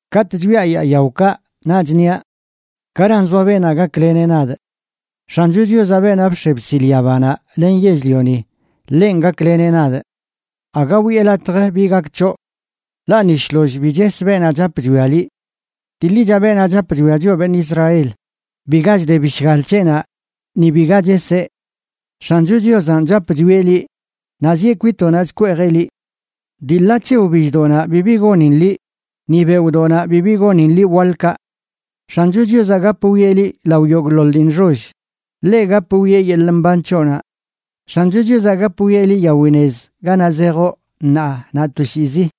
Katꞌ chwiaꞌ yaa yaokaꞌ, naꞌch niaꞌ: “¿Garan zoa beenaꞌ gakleneꞌ nadꞌ? X̱ancho Chiozaꞌ, beenaꞌ bx̱e bsil yabanaꞌ len yell-lioni, ḻenꞌ gakleneꞌ nadꞌ.” ¡Aga wiꞌe latj bi gak c̱hoꞌ! Ḻaꞌ ni shloll bi ches beenaꞌ chap chwia liꞌ. Dii ḻicha, beenaꞌ chap chwia choꞌ beṉꞌ Israel, biga chde bishgal c̱heꞌnaꞌ, ni biga cheseꞌ. X̱ancho Chiozanꞌ chap chwieꞌ liꞌ, naꞌ zieꞌ kwitoꞌnaꞌ chkweejeꞌ liꞌ. Dii ḻa c̱he wbilldoꞌnaꞌ bibi gonin liꞌ, ni beoꞌdoꞌnaꞌ bibi gonin liꞌ waḻkaꞌ. X̱ancho Chiozaꞌ gap wwieꞌ liꞌ lao yogꞌḻoḻ dii nxoll, ḻeꞌ gap wwieꞌ yeḻꞌ mban c̱hoꞌnaꞌ. X̱ancho Chiozaꞌ gap wwieꞌ liꞌ yawi nez ganaꞌ zejoꞌ ṉaa naꞌ toshiizi.